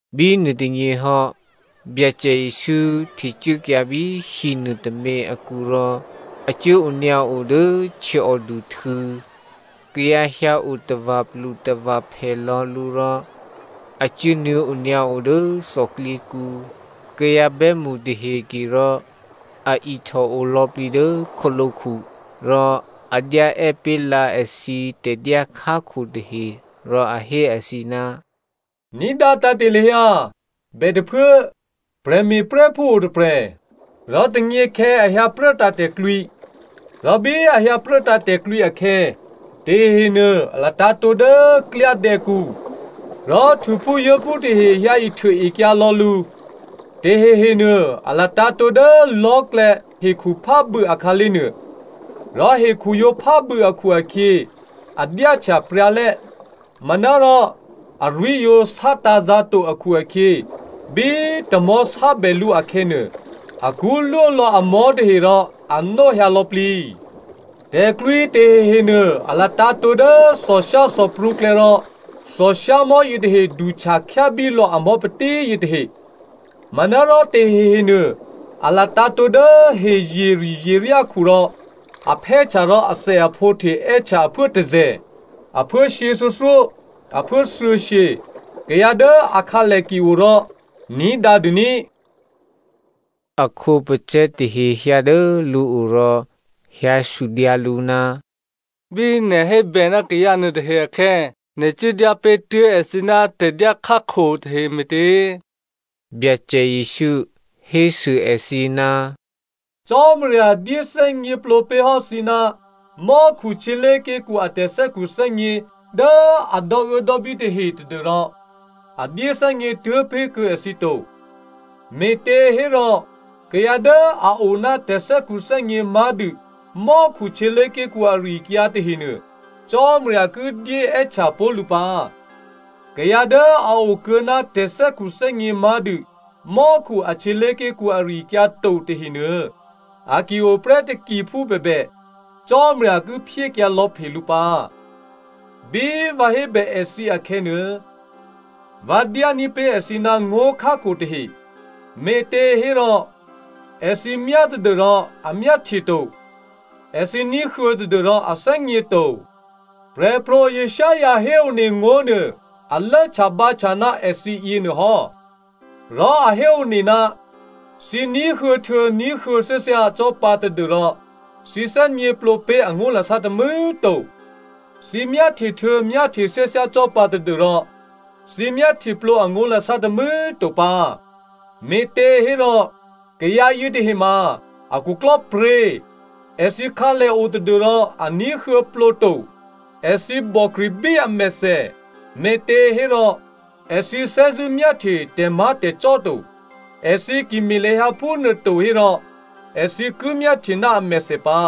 Bínuô tônyěhò́, Byacè Jesǔ htecuốkyǎ bí hinuô tômě akǔ rò a cuố onyǎo dố htyěòduhtû̌. Kayǎ hyǎo tava̤plutava̤phè lò̌ lǔ rò a cuốnuô̌ onyǎo dố thòklyěkǔ. Kayǎ bè́mṳ tahe ke rò a ihtòo lò̌plǐ dố khǒlǒkhu. Rò a dyá è́ pé̤ lǎ èthǐ tè̤dyá khákho tahe, rò a hé èthǐ, “Ní̤dǎ tǎ̤te̤ lahyǎ! Bètôphuố, prè̤me̤prè́phú o tôprè̤. Rò tônyěkhè̌ a hyǎ pruốtǎ̤ tè̤klwǐ. Rò bí a hyǎpruốtǎ̤ tè̤klwǐ akhè̌, tahehenuô a latǎ̤tǒ dố klyádè̌kǔ, rò htuphúzuố̤phú tahe hyǎihtuôekyǎ lò̌ lǔ. Tahehenuô a latǎ̤tǒ dố lò̤́klè̌ hekhuphábû̌ akhǎlé̤ nuô. Rò hekhu yǒ phábû̌ akhu-akhyě a dyáhtya pryǎ lè́. Manárò arwí̤ yǒ sátǎ̤zǎ̤ to akhu-akhyě, bí tamò̤́ sábè lǔ akhè̌nuô, akṳ́lwó lò̌ amò̤́ tahe rò anó hyǎlò̌plǐ. Tè̤klwǐ tahehenuô a latǎ̤tǒ dố thòshyáthòprǔklè̌ rò thòshyámò̤́ yětahe duhtya khyábí lò̌ amò̤́ patí yětahe. Manárò tahehenuô a latǎ̤tǒ dố hezyeri̤zyeryákhu rò a phè́htya rò athèaphǒhte è́htya aphuố tôzè̤, aphuố shyěthuô̌thyó, aphuố thuô̌shyě. Kayǎ dố akhǎlè ki o rò ní̤dǎdû ní꤮.” A khǒpacè̤̌ tahe hyǎ dố lǔo rò hyǎsudyǎ lǔ, “Bí nè̤ hébè ná kayǎ nuôtahe akhè̌ nè̤ cuố dyápé̤ tuố̤ èthǐ ná tè̤dyá khákho tahe me̤tě?” Byacè Jesǔ hésû èthǐ, “Cò́marya dyéthè́gněplǒ pé̤hò́ thǐ ná mò́khu htyělé̤ké̤kǔ a tè̤thè́khuthè́gně dố a dò́uốdò́bí tahe tadû́rò a dyéthè́gně tuố̤ pé̤kuô̌ èthǐ to. Me̤těhérò kayǎ dố a o ná tè̤thè́khuthè́gně má̤dû mò́khu htyělé̤ké̤kǔ ari-akyǎ tahenuô Cò́marya ki dyé è́htya pó̤ lǔ pǎ. Kayǎ dố a o kuô̌ ná tè̤thè́khuthè́gně má̤dû mò́khu a htyělé̤ké̤kǔ ari-akyǎ to tahenuô, a ki o prè́ takiphú bèbè, Cò́marya ki phyékyǎlò̌phe lǔ pǎ. Bí vǎ hébè èthǐ akhè̌nuô, vǎ dyání̤ pé̤ èthǐ ná ngó̤khákho tahe, me̤těhérò Èthǐ myá tadû́rò a myáhtye to. Èthǐ ní̤huô̌ tadû́rò a thè́gně to. “Prè̤pro̤ Isaiah héone ngó̤nuô a lốhtyabǎhtya ná èthǐ yěnuô hò́. Rò a héone, ‘Thǐ ní̤huô̌htuô̌ ní̤huô̌ thyáthyá cò́ pǎ tadû́rò thǐ thè́gněplǒ pé̤ angó̤lasá tômû̌꤮ to, thǐ myáhtyehtuô̌ myáhtye thyáthyá cò́ pǎ tadû́rò thǐ myáhtyeplǒ angó̤lasá tômû̌꤮ to pǎ. Me̤těhérò kayǎ yětahe ma a khuklò́pryě̤, èthǐ khǎlè o tadû́rò a ní̤huô̌plǒ to, èthǐ bòkri̤bí amèthè me̤těhérò èthǐ thè́zṳ̂́ myáhtye tè̤má̤tè̤cò́ to. Èthǐ ki me̤ lahyǎ phúnuôto hérò èthǐ ki myáhtye ná amèthè pǎ,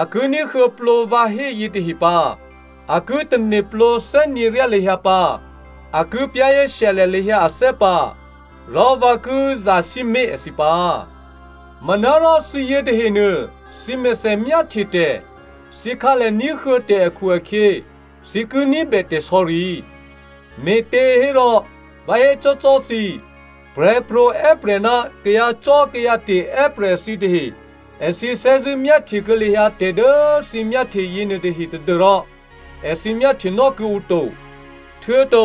a ki ní̤huô̌plǒ vǎ hé yětahe pǎ, a ki tane̤plǒ thè́gněryá lahyǎ pǎ, a ki za̤ ní̤dû lahyǎ ané̤ pǎ, rò vǎ ki zasǐmé̤ èthǐ pǎ.’ “Manárò thǐ yětahenuô, thǐmèthè myáhtye tè̤, thǐkhǎlè ní̤huô̌ tè̤ akhu-akhyě thǐ ki ní̤bè tè̤sò̌ri. Me̤těhérò, vǎ hécò́cò́ thǐ, prè̤pro̤ è́prè̤ ná kayǎcò́kayǎte̤ è́prè̤ thǐtahe èthǐ thè́zṳ̂́ myáhtyekuô̌ lahyǎ tè̤ dố thǐ myáhtye yěnuôtahe tadû́rò èthǐ myáhtyenò́ kuô̌ǔ to. Htuô̌to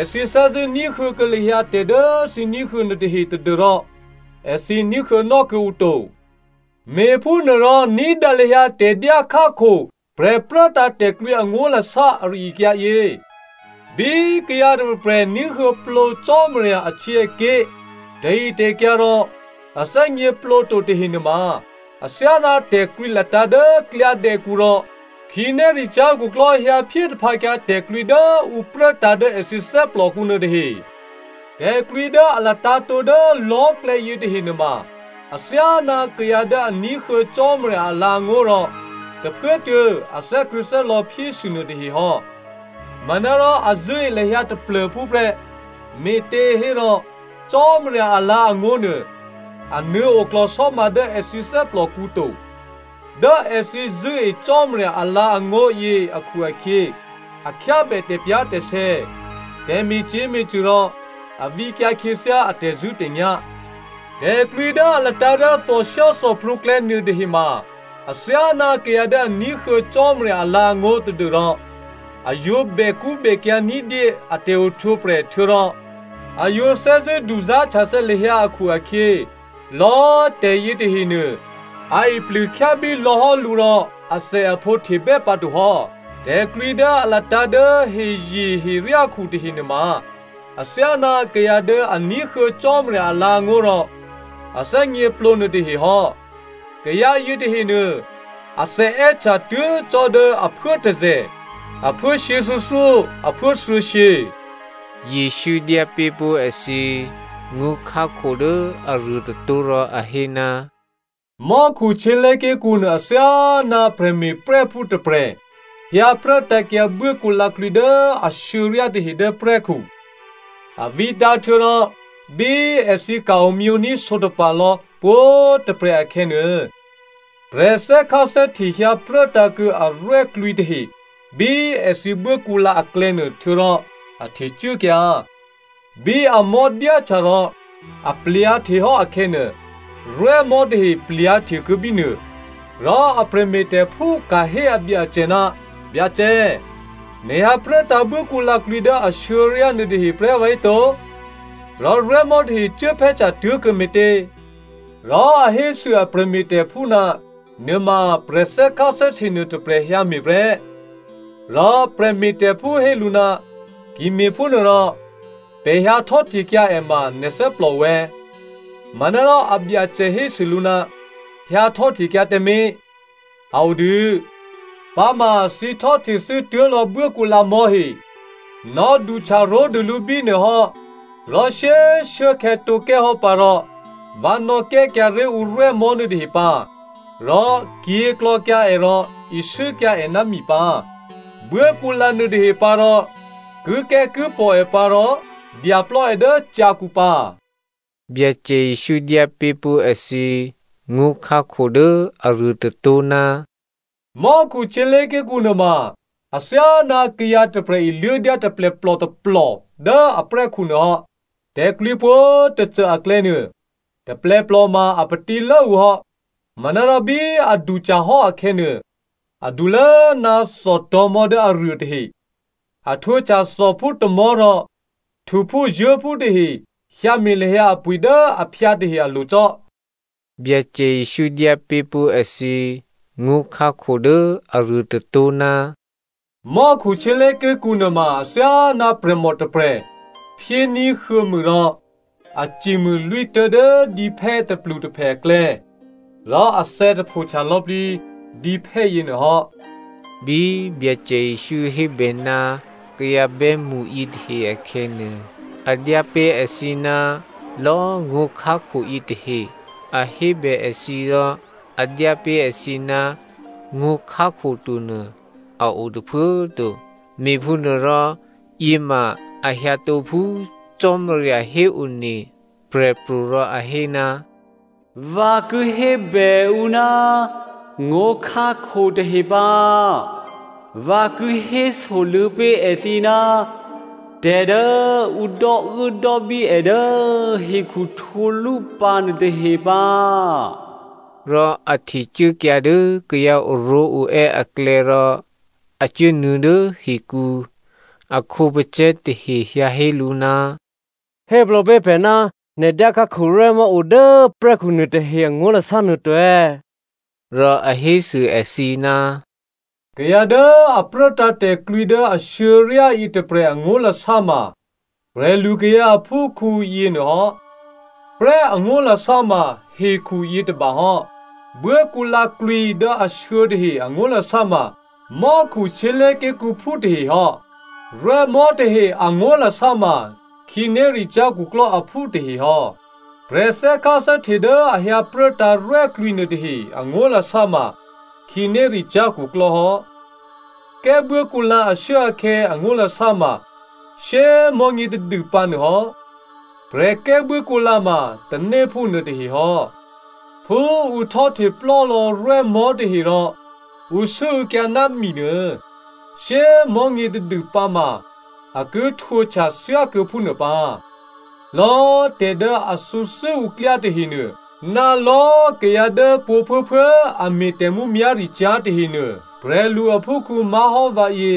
èthǐ thè́zṳ̂́ ní̤huô̌kuô̌ lahyǎ tè̤ dố thǐ ní̤huô̌ nuôtahe tadû́rò èthǐ ní̤huô̌nò́ kuô̌ǔ to. “Me̤phúnuôrò ní̤dǎ lahyǎ tè̤dyá khákho prè̤pruốtǎ̤ tè̤klwǐ angó̤lasá ari-akyǎ yě. Bí kayǎ tôprè̤prè̤ ní̤huô̌plǒ Cò́marya ahtyěaké̤ tè̤ritè̤kyǎ rò a thè́gněplǒ to tahe nuôma athyáná tè̤klwǐ latǎ̤ dố klyádè̌kǔ rò khǐnéricyá̤ khuklò́ hyǎphyé taphǎkyǎ tè̤klwǐ dố ǔ pruốtǎ̤ dố èthǐ thè́plòkǔ nuôtahe. Tè̤klwǐ dố a latǎ̤tǒ dố lò̤́klè̌ yětahe nuôma athyáná kayǎ dố a ní̤huô̌ Cò́marya alǎ̤angó̤ rò tôphuốtuô̌ a thè́krṳ̂̌thè́lò̌ phyésû nuôtahe hò́. Manárò a zṳ̂́e lahyǎ taplô̤phú prè́, me̤těhérò Cò́marya alǎ̤angó̤ nuô, a nuô̌ oklò̤sò́ma dố èthǐ thè́plòkǔ to. Dố èthǐ zṳ̂́e Cò́marya alǎ̤angó̤ yě akhu-akhyě, a khyábè tè̤pyá̤tè̤sè̌, tè̤me̤cyě̤me̤cṳ̂ rò a vǐkyǎ khyěthyá a tè̤zṳ̂́tè̤nyá̤. Tè̤klwǐ dố a latǎ̤ dố thòshyáthòprǔklè̌ nuôtahe ma athyáná kayǎ dố a ní̤huô̌ Cò́marya alǎ̤angó̤ tadû́rò a yǒ bèkṳ́bèkyǎ̤ ní̤dyé ná a tè̤ohtwǒprè̤ htuô̌rò a yǒ thè́zṳ̂́ duzá̤htyathè̌ lahyǎ akhu-akhyě, lò̌꤮ tè̤yětahenuô a iplûkhyábíkyǎ lò̌hò́ lǔ rò athèaphǒ htebè́ pǎtohò́. Tè̤klwǐ dố a latǎ̤ dố hezyeheryákhu tahe nuôma athyáná kayǎ dố a ní̤huô̌ Cò́marya alǎ̤angó̤ rò a thè́gněplǒ nuôtahe hò́. Kayǎ yětahenuô athè è́htya tuố̤ cò́ dố aphuố tôzè̤, aphuố shyěthuô̌thyó, aphuố thuô̌shyě.” Jesǔ dyá pé̤ pó̤ èthǐ ngó̤khákho dố aruô tôtó̤ rò a hé, “Mò́khu htyělé̤ké̤kǔ nuô athyáná prè̤me̤prè́phú tôprè̤ hyǎpruốtǎ̤kyǎ buốkǔlǎklwǐ dố ashuô̌ryá tahe dố prè́khu. A vǐtǎ̤ htuô̌rò bí èthǐ ka̤ omyění̤ sǒtapa̤ lò̌ pwǒ̤꤮ tôprè̤ akhè̌nuô, prè̤ thè́kháthè́hte hyǎ pruốtǎ̤kuô̌ arwè́klwǐ tahe bí èthǐ buốkǔlǎ aklè̌nuô, htuô̌rò a htecuốkyǎ. Bí amò̤́ dyáhtya rò aplyǎ̤ htehò́ akhè̌nuô, rwè́mò̤́ tahe plyǎ̤htekuô̌ bínuô. “Rò a prè̤me̤tè̤phú ka̤hé abyacè, ‘Byacè, nè̤ hyǎ pruốtǎ̤ buốkǔlǎklwǐ dố ashuô̌ryá nuôtahe prè́ vǎhéto꤮? Rò rwè́mò̤́ tahe cuốphè́htya tuố̤kuô̌ me̤tě?’ “Rò a hésû a prè̤me̤tè̤phú, ‘Nuôma prè̤thè́kháthè́hte nuôtôprè̤ hyǎme̤ prè́.’ “Rò a prè̤me̤tè̤phú hé lǔ, ‘Ki me̤phúnuôrò, pè̤ hyǎ htò́htekyǎ è ma nè̤ thè́plòo è̌?’ “Manárò abyacè hésû lǔ, ‘Hyǎhtò́htekyǎ tǎmé̤, a odû, pǎma thǐ htò́htethû́ tuố̤lò̌ buốkǔlǎ mò̤́he. Nò̌duhtya ró̤dû lǔ bínuô hò́, rò shyé꤮ shuốkhè̌tǒkè́hò́ pǎ rò vǎ nò̌kè́kyǎ ré̤ ǔ rwè́mò̤́ nuôtahe pǎ rò kyě̤klò̌kyǎ è rò isû́kyǎ è ná mi pǎ. Buốkǔlǎ nuôtahe pǎ rò kikè́kipò̤ è pǎ rò dyaplò́ è dố cyǎkǔ pǎ.’” Byacè Jesǔ dyápé̤pó̤ èthǐ ngó̤khákho dố aruô tôtó̤, “Mò́khu htyělé̤ké̤kǔ nuôma athyáná kayǎ tôprè̤ iluố̤dyá taplèplò tôplò dố aprè́khu nuôhò́. Tè̤klwǐ pwǒ̤꤮ tôcô aklè̌nuô taplèplò ma a patílố ǔ hò́. Manárò bí a duhtyahò́ akhè̌nuô, adulố ná thòtò̤̌mò̤́ dố aruô tahe. A htwǒhtya thòphú tômò̤́ rò htuphúzuố̤phú tahe hyǎme̤ lahyǎ apwi̤ dố aphyǎ tahe alo̤ cò́.” Byacè Jesǔ dyápé̤ pó̤ èthǐ ngó̤khákho dố aruô tôtó̤, “Mò́khu htyělé̤ké̤kǔ nuôma athyáná prè̤mò tôprè̤ phyéní̤ huô̌mû rò a cimû lwítố̤ dố dǐphè́ tôplutôphè aklè̌ rò athè̌ tapho htyalò̌plǐ dǐphè́ yěnuôhò́.” Bí Byacè Jesǔ hébè ná kayǎ bè́mṳ yětahe akhè̌nuô, a dyápé̤ èthǐ ná lò̌꤮ ngó̤khákho yětahe. A hébè èthǐ rò a dyápé̤ èthǐ ná ngó̤khákho tonuô a o tôphuố꤮ to. Me̤phúnuôrò yěma a hyǎtǒ phú Cò́marya héone prè̤pro̤ rò a hé, “Vǎ ki hébè ǔ ná ngó̤khákho tahe pǎ, vǎ ki hésoluô̌ pé̤ èthǐ ná tè̤ dố ǔ dò́uốdò́bí è dố hekhu htwǒlúpǎ nuôtahe pǎ.” Rò a htecuốkyǎ dố kayǎ oró̤oè́ aklè̌ rò a cuốnuô̌ dố hikǔ, a khǒpacè̤̌ tahe hyǎ hé lǔ, “Héplǒ pé̤ pè̤ ná nè̤ dyá khákho rwè́mò̤́ o dố prè́khu nuôtahe angó̤lasá nuô to.” Rò a hésû èthǐ, “Kayǎ dố a pruốtǎ̤ tè̤klwǐ dố ashuô̌ryá yětôprè̤ angó̤lasá ma prè̤lukayǎ aphúkhǔ yěnuô hò́. Prè́ angó̤lasá ma hekhu yětôba hò́, buốkǔlǎklwǐ dố ashuô̌ tahe angó̤lasá ma mò́khu htyělé̤ké̤kǔphú tahehò́, rwè́mò̤́ tahe angó̤lasá ma khǐnéricyá̤ khuklò́ aphú tahehò́. Prè̤thè́kháthè́hte dố a hyǎ pruốtǎ̤ rwè́klwǐ nuôtahe angó̤lasá ma khǐnéricyá̤ khuklò́ hò́. Kè́buốkǔlǎ ashuốakhè̌ angó̤lasá ma shyé꤮ mò̤́nyě tadûpǎ nuô hò́. Prè̤kè́ buốkǔlǎ ma tanéphú nuôtahe hò́. “Phú ǔ htò́hte plò́lò̌ rwè́mò̤́ tahe rò ǔ sû́û̌kyǎ ná mi nuô, shyé꤮ mò̤́nyě tadû pǎma a ki htwǒhtya thyákuô̌ phúnuô pǎ. Lò̌꤮ tè̤ dố a thǔ thû́ǔklyá tahenuô, ná lò̌꤮ kayǎ dố pwǒ̤꤮ phuốphuố a me̤ tè̤mǔmyá̤ricyá̤ tahenuô, prè̤lu aphúkhǔ má̤hò́ vǎyě,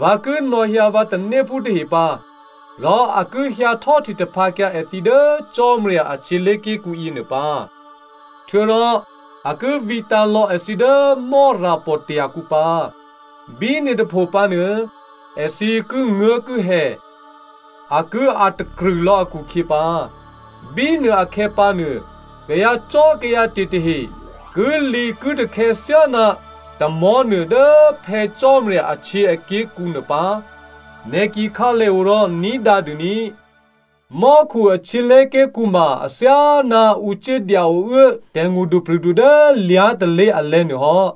vǎ ki nò̌hyǎ vǎ tanéphú tahe pǎ rò a ki hyǎ htò́hte taphǎkyǎ èthǐ dố Cò́marya a htyělé̤ké̤kǔ yěnuô pǎ. Htuô̌rò a ki vǐtǎ̤lò̌ èthǐ dố Mò́rapò̤tya̤ kǔ pǎ. Bínuô tôpho pǎnuô èthǐ kinguố̤kihè, a ki a̤takrṳ̂ lò̌ akhukhyě pǎ. Bínuôakhè̌ pǎnuô, kayǎcò́kayǎte̤ tahe kilǐkitakhè̌ thyáná tamò̤́ nuô dố Phè̌ Cò́marya ahtyěaké̤kǔ nuô pǎ. Nè̤ ki khǎlèo rò ní̤dǎdû ní꤮. “Mò́khu a htyělé̤ké̤kǔ ma athyáná ǔ cuốdya ouố tè̤ngṳdupri̤du dố lyá̤ tôlé̤ alè̤̌nuô hò́.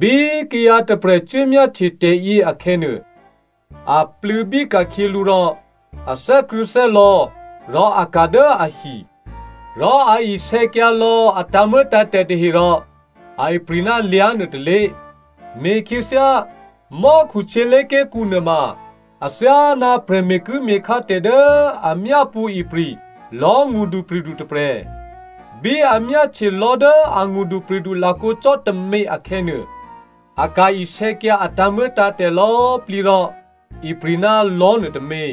Bí kayǎ tôprè̤ cuốmyáhtye tè̤yě akhè̌nuô, a plû̌bí ka̤khyě lǔ rò a thè́krṳ̂̌thè́lò̌ rò a ka̤ dố ahi. Rò a isè̌kyǎ lò̌ a tǎ̤muô̌tǎ̤tè̤ tahe rò a ipri̤ ná lyá̤nuô tôlé̤. “Me̤khyěthyá, mò́khu htyělé̤ké̤kǔ nuôma athyáná prè̤ me̤kuố̤me̤khá tè̤ dố a myápṳ̌ ipri̤ lò̤́ ngṳdupri̤du tôprè̤. Bí a myáhtye lò̤́ dố a ngṳdupri̤du lakǒ cò́ tômě akhè̌nuô, a ka̤ isè̌kyǎ a tǎ̤muô̌tǎ̤tè̤ lò̌꤮ plǐ rò ipri̤ ná lò̤́ nuôtômě.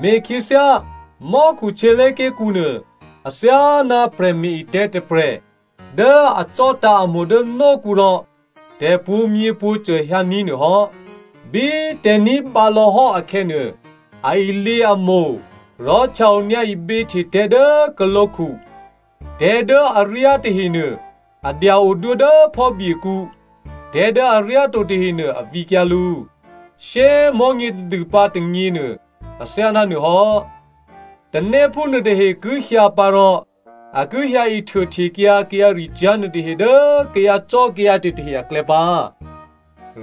“Me̤khyěthyá, mò́khu htyělé̤ké̤kǔ nuô athyáná prè̤me̤-etè̤̌ tôprè̤ dố a vǐtǎ̤ itavǐ dố htyěkǔ rò tè̤̌ pwǒ̤myěpwǒ̤cô hyǎní̤ nuô hò́. Bí tè̤̌ ní̤ bǎlò̌hò́ akhè̌nuô, a ilyě itavǐ rò htya-onyǎ iběhte tè̤̌ dố khǒlǒkhu. Tè̤̌ dố aryá tahenuô a dya-odwó dố phò́byekǔ, tè̤̌ dố aryáto tahenuô a vǐkyǎ lǔ. Shyé꤮ mò̤́nyě tadû pǎ tônyěnuô, athyáná nuôhò́, tanéphú nuôtahe ki hyǎ pǎ rò a ki hyǎ ihtuô htekyǎ kayǎricyá̤ nuôtahe dố kayǎcò́kayǎte̤ tahe aklè̌ pǎ.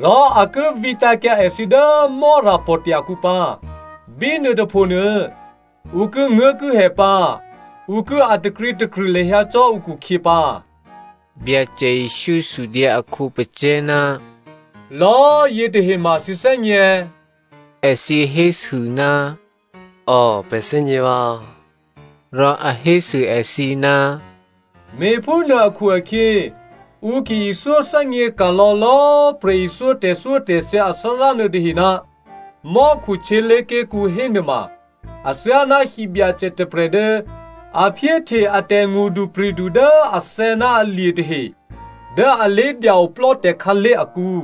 Rò a ki vǐtǎ̤kyǎ èthǐ dố Mò́rapò̤tya̤ kǔ pǎ. Bínuô tôphonuô ǔ kinguố̤kihè pǎ, ǔ ki a̤ takrǐtakrṳ̂ lahyǎ cò́ ǔkhukhyě pǎ.” Byacè Jesǔ sudyǎ a khǒpacè̤̌, “Lò̌꤮ yětahe ma thǐ thè́gně è̌?” Èthǐ hésû, “Ò, pè̤ thè́gně vǎ.” Rò a hésû èthǐ, “Me̤phúnuô akhu-akhyě ǔ ki ithyóthè́gně ka̤lò̌ lò̌꤮ prè̤ithyó tè̤thyótè̤thya athárá nuôtahe ná mò́khu htyělé̤ké̤kǔ hénuôma, athyáná hibyacè tôprè̤ dố a phyéhte a tè̤ngṳdupri̤du dố athè̌ ná alye̤ tahe dố alé̤ dya-oplò́ tè̤khǎlé̤ akǔ.”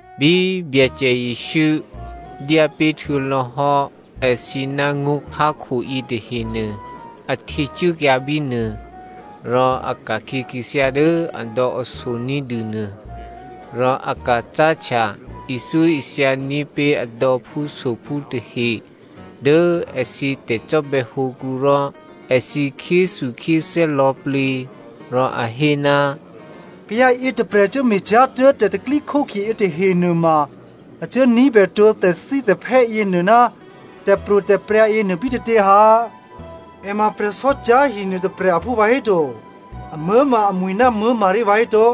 Bí Byacè Jesǔ dyá pé̤ htuô̌lò̌hò́ èthǐ ná ngó̤khákho yětahenuô a htecuốkyǎ bínuô. Rò a ka̤khyě khyěthyá dố adò̌aso ní̤dûnuô, rò a ka̤ cáhtya ithyóithya ní̤pé̤ adò̌phúsophú tahe dố èthǐ tè̤cò́bè̌hǒkǔ rò èthǐ khyéthukhyéthè́ lò̌plǐ, rò a hé, “Kayǎ yětôprè̤ cuốme̤cyá̤ tuố̤ tè̤pro̤tè̤prya̤ yětahe nuôma a cuốní̤bè tǒ tè̤thítè̤phè́ yěnuô ná tè̤pro̤tè̤prya̤ yěnuô bítětě ha? È ma prè̤sò́cyá̤hi nuôtôprè̤ aphú vǎhéto? Amuố̤ ma amwi̤ ná Maria vǎhéto?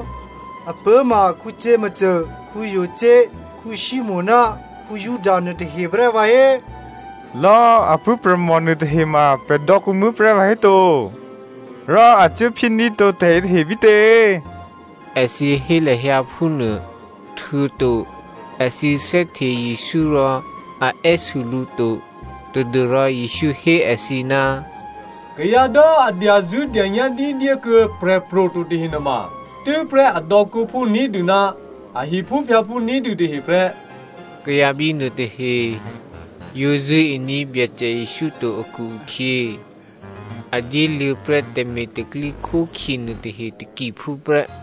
Apuố̤ ma Jakomo, Jose, Simonè ná Juda nuôtahe prè́ vǎhé꤮? Lò̌꤮ apuố̤prè̤mò nuôtahe ma pè̤ dò̌kǔmuố̤ prè́ vǎhéto꤮? Rò a cuố phyéní̤tǒ tè̤yě tahe bítě?” Èthǐ hé lahyǎ phúnuô, htuô̌to èthǐ thè́hte Jesǔ rò a è́sû lǔ to, tadû́rò. Jesǔ hé èthǐ, “Kayǎ dố a dyazṳ̂́dyanyá̤ ní̤dyékuô̌ prè̤pro̤ to tahe nuôma tû́prè́ adò̌kǔphú ní̤dû ná a hiphúphyǎphú ní̤dû tahe prè́.” Kayǎ bínuô tahe yǒ zṳ̂́ení̤ Byacè Jesǔ to akhu-akhyě, a dyéluô̌prè́ tè̤me̤ tè̤pro̤tè̤prya̤ nuôtahe takiphú prè́.